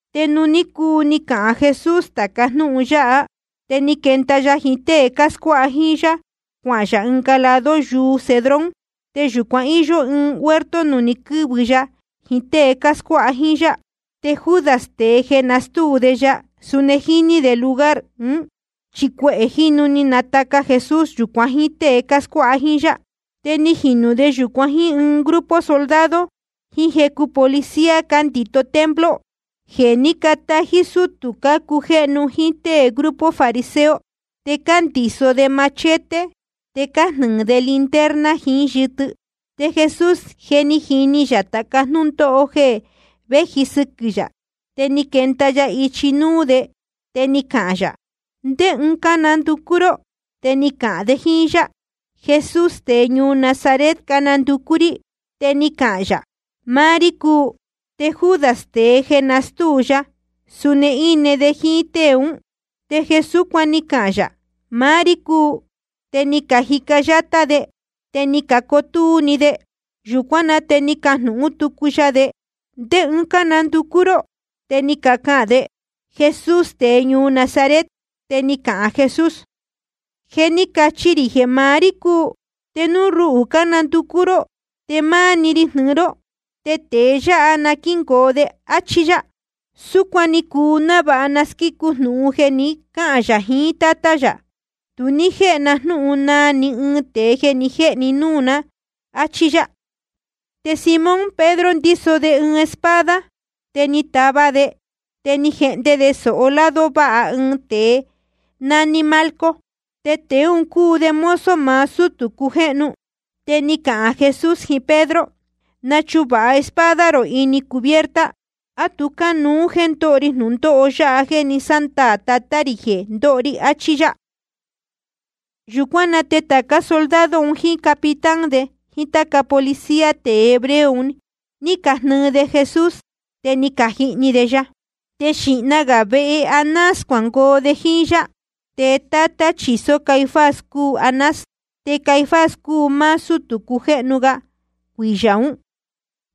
Te nuū ní cuu ni cahān Jesús tāca jnúhun yáha, te ni quenda ya jiín tée cáscuáha jíín yá, cuahān yā ɨnga lado yuu Cedrón. Te yūcuan íyó ɨɨn huerto nuū ní quɨ̄vɨ ya jiín tée cáscuáha jíín yá. Te Judas, tēe jeē nastúu de ya, suni jíní de lugar un, chi cuehē jínu ni nataca Jesús yūcuan jíín tée cáscuáha jíín yá. Te ni jinū de yūcuan jíín ɨɨn grupo soldado jiín jecu policía cándito templo, jeē ní catají sutū cácujéhnu jíín tée grupo fariseo. Te cándiso de machete, te cájnɨɨ de linterna jiín yɨtɨ. Te Jesús je jíní yā tāca jnúndóho jeē véji sɨquɨ̄ yā. Te ni quenda ya ichi núú de, te ni cahān yā: ¿Ndé ɨɨn cánanducú ró? Te ni cacahān de jíín yá: Jesús tēe ñuu Nazaret cánanducú rí. Te ni cahān yā: Máá rí cúu. Te Judas, tēe jeē nástúu de ya, suni íne de jíín tée ún. Te jeē súcuan ni cahān yā, máá rí cúu, te ni cajica yátá de, te ni cacotúú‑ni de. Yūcuán na te ni cajnūhún tucu ya de: ¿Ndé ɨɨn cánanducú ró? Te ni cacahān de: Jesús tēe ñuu Nazaret. Te ni cahān Jesús: Je ni cachi rī jeē maá rí cúu. Te núu ruhū cánanducú ró, te máá‑ni ri jnɨɨ ró, te tēe yáha na quíngoo de. Achí yá. Súcuan ni cuu návāha na squícu jnūhun jeē ni cáhān yā jiín Tátá yā: Tu ní jéhe na jnúhun naa ni ɨɨn tēe jeē ni jéhe ni núū na, áchí yá. Te Simón Pedro ndíso de ɨɨn espada. Te ni tava de, te ni jehnde de sōho lado váha ɨɨn tēe nání Malco. Te tēe un cúu de mozo maá sútū cujéhnu. Te ni cahān Jesús jiín Pedro: Nachuvāha espada rō ini cubierta. ¿A tu cánuú jéē ndóho ri jnūndóho yáha jeē ni sándaā Tatá rī jeē ndóho ri? Achí yá. Yūcuán na te tācá soldado un, jíín capitán de, jíín táca policía tēe hebreo un, ni cajnɨɨ de Jesús, te ni cajihni de ya. Te xīhna gā vehe Anás cuangoo de jíín yá. Te tátá chīsó Caifás cúu Anás. Te Caifás cúu máá sútū cujéhnu ga cuiyā ún.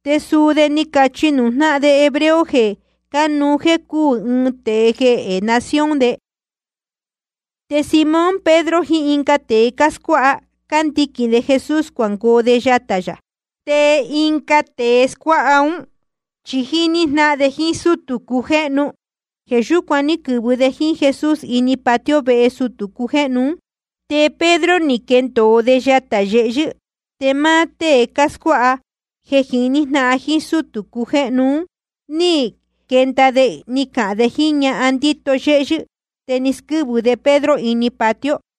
Te suu de ni cachi nuū jnáhan de hebreo jeē cánuú jéē cúū ɨɨn tēe jehē nación de. Te Simón Pedro jiín ɨnga tēe scuáha, cándiquīn de Jesús cuangoo de yatā yā. Te ɨnga tēe scuáha ún chi jíní jnáhan de jíín sútū cujéhnu. Jeē yúcuan ní quɨ̄vɨ de jíín Jesús ini patio vehe sutū cujéhnu ún. Te Pedro ni quendōo de yatā yehyɨ́. Te máá tée scuáha jéē jiní jnáhan jíín sútū cujéhnu ún, ni quenda de ni cahān de jíín ñahan ndíto yéhyɨ́, te ni squɨ́vɨ de Pedro ini patio.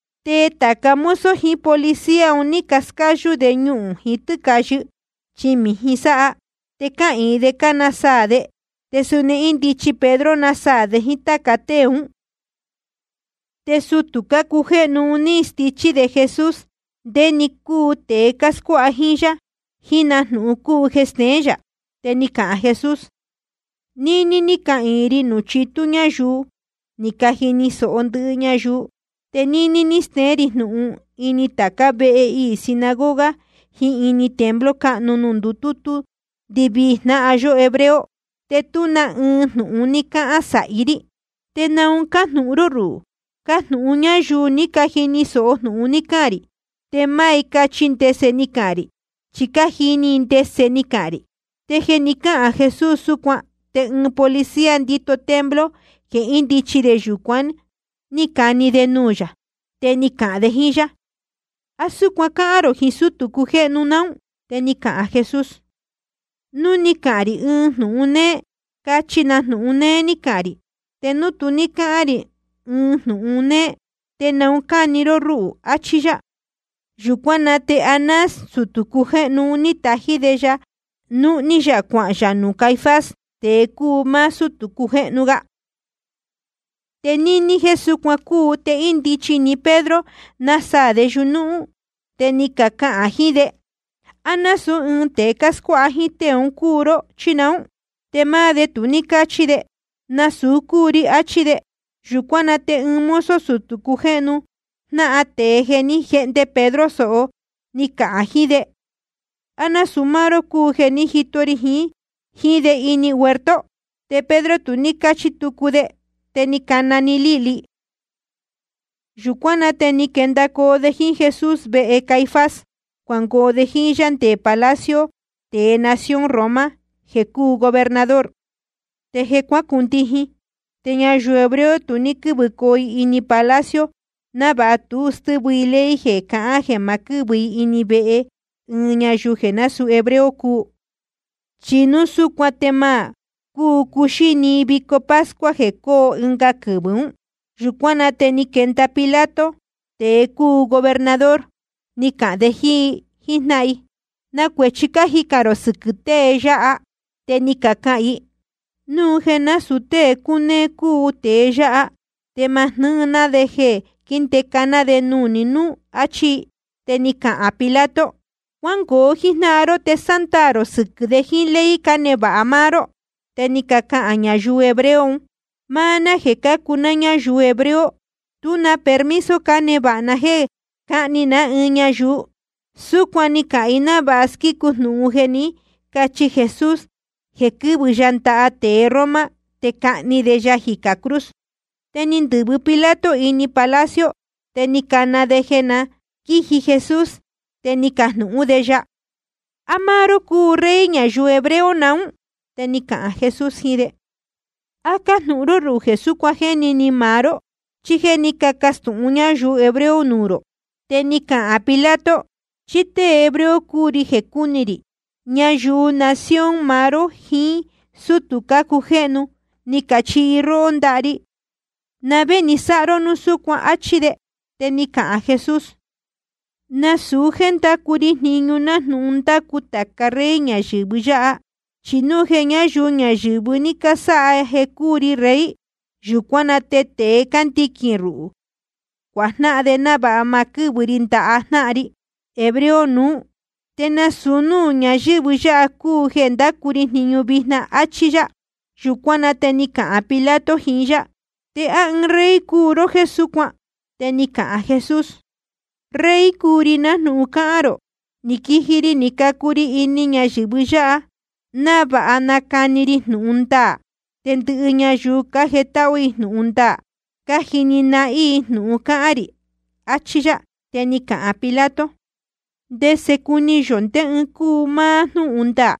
Te tāca mozo jiín policía un ní cascáyú de ñuhūn jiín tɨ́cāyɨ, chi mījin sáha. Te cáhīin de cánasaā de. Te suni índichi Pedro, násaā de jíín táca tée ún. Te sutū cujéhnu un ní stichí de Jesús ndé‑ni cúu tēe cáscuáha jíín yá, jiín na jnūhun cúu jeē steén yā. Te ni cahān Jesús: Níní ní cahān rī nuū chitú ñáyuu, ni cajini sōho ndɨhɨ ñayuu. Te níní ní steén rī jnūhun ini tācá vehe iī sinagoga jiín ini templo cáhnu nuū ndutútú ndɨvii jnáhan yó hebreo. Te tú ni ɨɨn jnūhun ní cáhán sāhi rí. ¿Te naun cájnūhun ró ruhū? Cajnūhun ñáyuu ní cajini sōho jnūhun ni cahān rī, te máá i cachi ndese ni cahān rī. Chi cájini i ndese ni cahān rī. Te jeē ni cáhān Jesús súcuan, te ɨɨn policía ndíto templo jeē índichi de yūcuán, ní cani‑ni de nuū yā. Te ni cahān de jíín yá: ¿A súcuan cáhán rō jiín sútū cujéhnu naún? Te ni cahān Jesús: Núu ni cahān rī ɨɨn jnūhun néé, cachi na jnūhun néé ní cahān rī. Te núu tu ní cáhán rī ɨɨn jnūhun néé, ¿te naun cáni ró rúhū? achí yá. Yūcuán na te Anás, sutū cujéhnu un, ní tají de ya, núhní yā cuahān yā nuū Caifás, tēe cúu máá sútū cujéhnu ga. Te níní jéē súcuan cúu, te índichi‑ni Pedro, násaā de yuñúhún. Te ni cacahān jiín de: ¿A násūú ɨɨn tēe scuáha jíín tée un cúu ró, chí naún? Te máá de tu ní cáchi de: Nasūu cúu ri, achí de. Yūcuán na te ɨɨn mozo sutū cujéhnu, jnáhan tēe jeē ní jehnde Pedro sōho, ni cahān jiín de: ¿A násūu máá ró cúu jeē ní jito ri jiín de ini huerto? Te Pedro tu ní cáchi tucu de. Te ni cana‑ni líhli. Yūcuán na te ni quendacoo de jíín Jesús vehe Caifás, cuangoo de jíín yá nde palacio tēe nación Roma jeē cúu gobernador. Te je cuacundijin. Te ñayuu hebreo tu ní quɨ́vɨcoo i ini palacio, návāha tu stɨ́vɨ i ley i jeē cahán jeē ma quɨ́vɨ i ini vehe ɨɨn ñayuu jeē násūú hebreo cúu. Chi núu súcuan te ma cúu cuxíni i vico pascua jeē cóo ɨnga quɨvɨ̄ ún. Yūcuán na te ni quenda Pilato, tēe cúu gobernador, ni cahān de jíín i jíjnáhan i: ¿Na cuēchi cájicān rō sɨquɨ̄ tée yáha? Te ni cacahān i: Núu jeē násūu tée cúnéé cúu tēe yáha, te ma jnɨ́ɨ ná de jeē quíndeca ná de nuū ni núú, áchí i. Te ni cahān Pilato: Cuángoo jíjnáhan ró, te sándaā rō sɨquɨ̄ de jíín ley cánevāha máá ró. Te ni cacahān ñayuu hebreo un: Máá ná jeē cácuu ná ñáyuu hebreo, tú na permiso cánevāha ná jéē cáhni ná ni ɨɨn ñayuu. Súcuan ni cacahān i návāha squícu jnūhun jeē ní cachi Jesús jeē quɨ́vɨ ya ndaha tēe Roma te cahni de ya jicā cruz. Te ni ndɨ̄vɨ Pilato ini palacio, te ni cana de jeē na quíji Jesús. Te ni cajnūhún de ya: ¿A máá ró cúu Rey ñayuu hebreo naún? Te ni cahān Jesús jiín de: ¿A cájnūhun ró ruhū jeē súcuan jéni ni maá ró, chí jéē ní cacastūhun ñáyuu hebreo nuū rō? Te ni cahān Pilato: ¿Chí tée hebreo cúu ri jeē cúni rī? Ñayuu nación maá ró jiín sútū cácujéhnu ni cachihi róhó ndaha ri. ¿Na vé ni sáha ró núu súcuan? Achí de. Te ni cahān Jesús: Nasūu jéē ndácu ri jniñu nájnūhun cándacu tāca rey ñayɨ̄vɨ yáha. Chi núu jeē ñáyuu ñayɨ̄vɨ ní casáha jeē cúu ri rey, yūcuán na te tēe cándiquīn ruhū, cuajnáhan de návāha ma quɨ́vɨ ri ndaha jnáhan ri hebreo nuú. Te nasūu núū ñayɨ̄vɨ yáha cúu jeē ndácu ri jniñu vijna. Achí yá. Yūcuán na te ni cahān Pilato jiín yá: ¿Te á ɨɨn rey cúu ró jéē súcuan? Te ni cahān Jesús: Rey cúu ri, nájnūhun cáhán rō. Ni quiji ri ni cacu ri ini ñayɨ̄vɨ yáha návāha nacani ri jnūhun ndaā. Te ndɨhɨ ñayuu cájetáhú jnúhun ndaā, cájini nahín i jnūhun cáhán rī. Achí yá. Te ni cahān Pilato: ¿Ndese cuni yō ndé ɨɨn cúu máá jnúhun ndaā?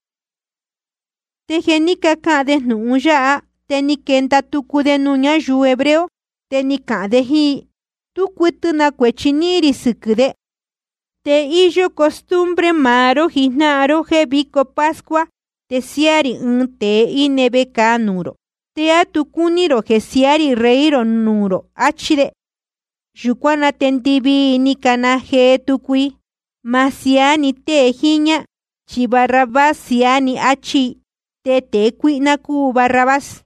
Te jeē ni cáhān de jnūhun yáha, te ni quenda tucu de nuū ñáyuu hebreo. Te ni cahān de jíín i: Tú cuɨtɨ na cuēchi níhín rī sɨquɨ̄ de. Te íyó costumbre maá ró jijnáhan ró jéē vico pascua te siáá rī ɨɨn tēe íne vecāa nuū rō. ¿Te á tu cácuni rō jeē siaá rī Rey rō nuū rō? Achí de. Yūcuán na te ndɨvii i ni cacana jee tucu i: Ma siaá ni tée jíñá, chi Barrabás siaá ni, áchí i. Te tēe cuíhná cúu Barrabás.